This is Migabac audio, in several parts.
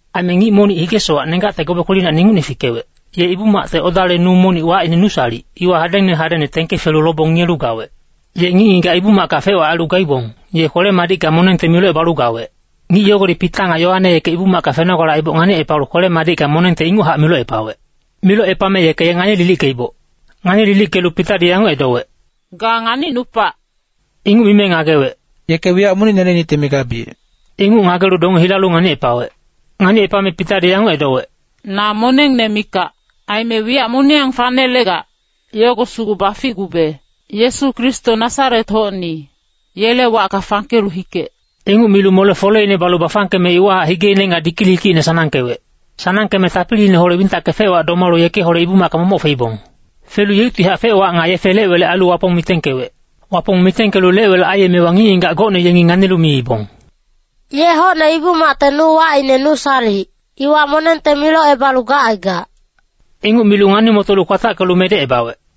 Aime ngic monic hige-sowac nenggacte gobe kwelinacni ingucne fikewec, ye Ibu-macte odale nu monic wacine Nusalic, iwa hadengne hadengne tengke felu lobong ngiyelu gawec. Ye ngic-ngigac Ibu-macka fec-wac ailu gaibong, yenge kwele-madicka monengte milocebalu gawec. Ngic yogodi Pita nga Yoane yeke Ibu-macka fenogale aiboc nganicepalu kwele-madicka monengte inguchac milocepawec. Milocepame yeke ye ngani-lilickeiboc. Ngani-lilickelu Pitadi yanguc edowec, “Ga nganicnupac!” Inguc mime ngagewec, “Yeke wiyac monic nelenicte migabiyec.” Inguc ngagelu donge hilalu nganicepawec. Nganicepame Pitadi yanguc edowec, “Na monengne mikac. Aime wiyac moniyang fanelegac, yogo sugu baficgube! Yesu Kristo Nasaret-hocni, yele wacka fangkelu hikec.” Inguc milu mole-foleine balu bafangkeme iwahac higeine nga dikilikicine sanangkewec. Sanangkeme tapiliineholec wintacke fe-wac domalu yekeholec Ibu-macka momoc feibong. Felu yeuctihac fec-wac nga yefe lec-welec ailu Wapong mitengkewec. Wapong mitengkelu lec-welec aiyemewa ngic-ngigac gocne yengi nganilu miibong, “Ye hocne Ibu-macte nu wacine Nusalic, iwa monengte milocebalu gacaigac.” Inguc milu ngani-motolu kwatackelu medecebawec.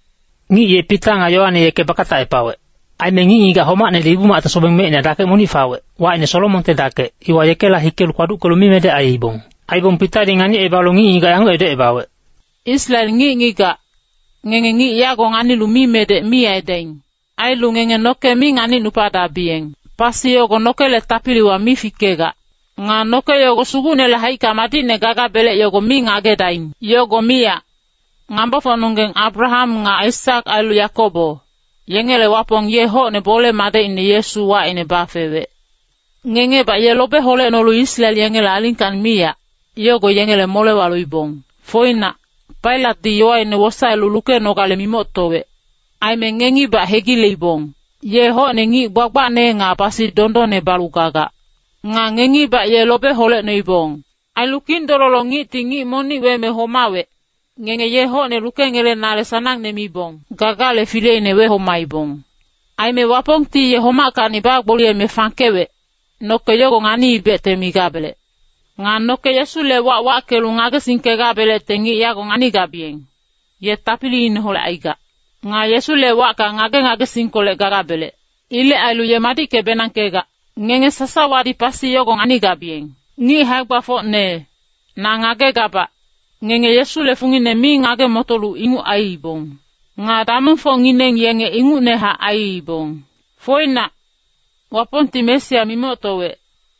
Ngic ye Pita nga Yoane yeke bakatacepawec. Aime ngic-ngigac homacnedi Ibu-macte sobeng mecina dakec monic fawec, wacine Solomonte Dakec, iwa yekela hikelu kpaduckelu mimedec aiibong. Aibong Pitadi nganicebalu ngic-ngigac yanguc edocebawec, “Israel ngic-ngigac, ngenge ngic yago nganilu mimedec mi aidaing. Ailu ngenge noke mi nganicnupadabiyeng. Pasi yogo nokele tapiliwa mi fikegac. Nga noke yogo Sugucnele haicka madicne gagabelec yogo mi ngagedaing. Yogo miyac, ngambofocnonggeng Abraham nga Aisak ailu Yakobo, yengele Wapong ye hocne bole-madecine Yesu wacine bafewec. Ngengebac ye lobe holecnolu Israel yengele alingkacni miyac, yogo yengele molewa loibong. Foinac, Pailatdi yowaine wosaelu lukenogale mimoctowec. Aime ngengibac hegileibong. Ye hocne ngic gbagbacne nga pasi dondonne balu gagac. Nga ngengibac ye lobe holecnoibong. Ailu kindololo-ngicti ngic monic weme homawec, ngenge ye hocne lukengelenale sanangne mibong gagale fileine wehomaibong. Aime Wapongti ye homackacni bagboliyeme fangkewec, noke yogo nganiibecte migabelec. Nga noke Yesule wac wackelu ngagesingkegabelecte ngic yago nganigabiyeng, ye tapiliineholec aigac. Nga Yesule wacka ngage-ngagesingkolec gagabelec. Ilec ailu ye madicke-benangkegac. Ngenge sasawadi pasi yogo nganigabiyeng. “Ngic hae-gbafocne, na ngagegabac, ngenge Yesule fungine mi ngage-motolu inguc aiibong. Nga damongfocngineng yenge ingucnehac aiibong. Foinac, Wapongti Mesia mimoctowec,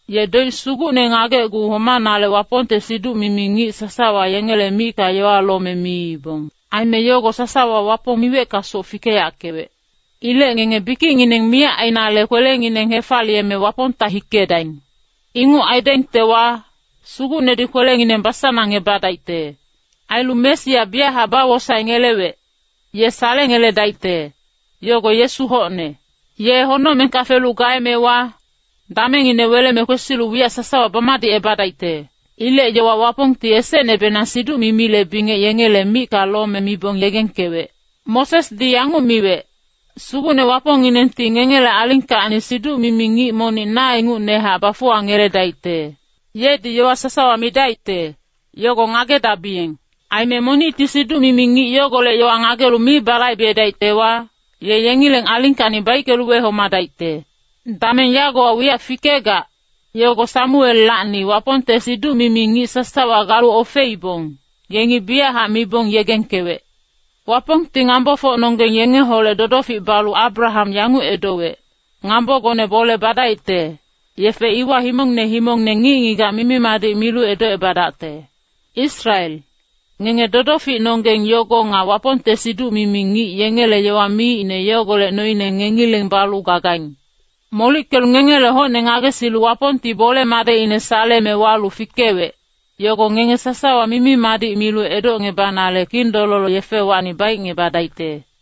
ye doic sugucne ngagecgu homanale Wapongte siduc-mimi ngic sasawa yengele micka yowa lome miibong. Aime yogo sasawa Wapong miweckasoc fikeyackewec. Ilec ngenge bikicngineng miyac ainale kwelengineng hefaliyeme Wapongta hikedaing. Inguc aidaingtewa, Sugucnedi kwelengineng basanangebadaicte. Ailu Mesia biyachac bawosaengelewec, ye salengeledaicte, yogo Yesu hocne. Ye honocmengka felu gaemewa, damengine weleme kwesilu wiyac sasawa bamadicebadaicte. Ilec yowa Wapongti esecnebenang siduc-mimile bingec yengele micka lome mibong yegengkewec. Mosesdi yanguc miwec, ‘Sugucne Wapongnginengti ngengele alingkacni siduc-mimi ngic monic na ingucnehac bafuwangeledaicte. Yedi yowa sasawa midaicte, yogo ngagedabiyeng. Aime monicti siduc-mimi ngic yogolec yowa ngagelu mi balaibedaictewa, ye yengileng alingkacni baickelu wehomadaicte.’ “Dameng yagowa wiyac fikegac, yogo Samuellacni Wapongte siduc-mimi ngic sasawa galu ofeibong, yengi biyachac mibong yegengkewec. Wapongti ngambofocnonggeng yengeholec dodofic balu Abraham yanguc edowec, ‘Ngambogone bole badaicte, yefe iwa himongne himongne ngic-ngigac mimi-madic milu edocebadacte.’ Israel, ngenge dodoficnonggeng yogo nga Wapongte siduc-mimi ngic yengele yowa miicne yogolec noine ngengileng balu gagaing. Molickelu ngengele hocne ngagesilu Wapongti bole-madecine saleme walu fikewec, yogo ngenge sasawa mimi-madic milu edocngebanale kindololo yefewacni baicngebadaicte.”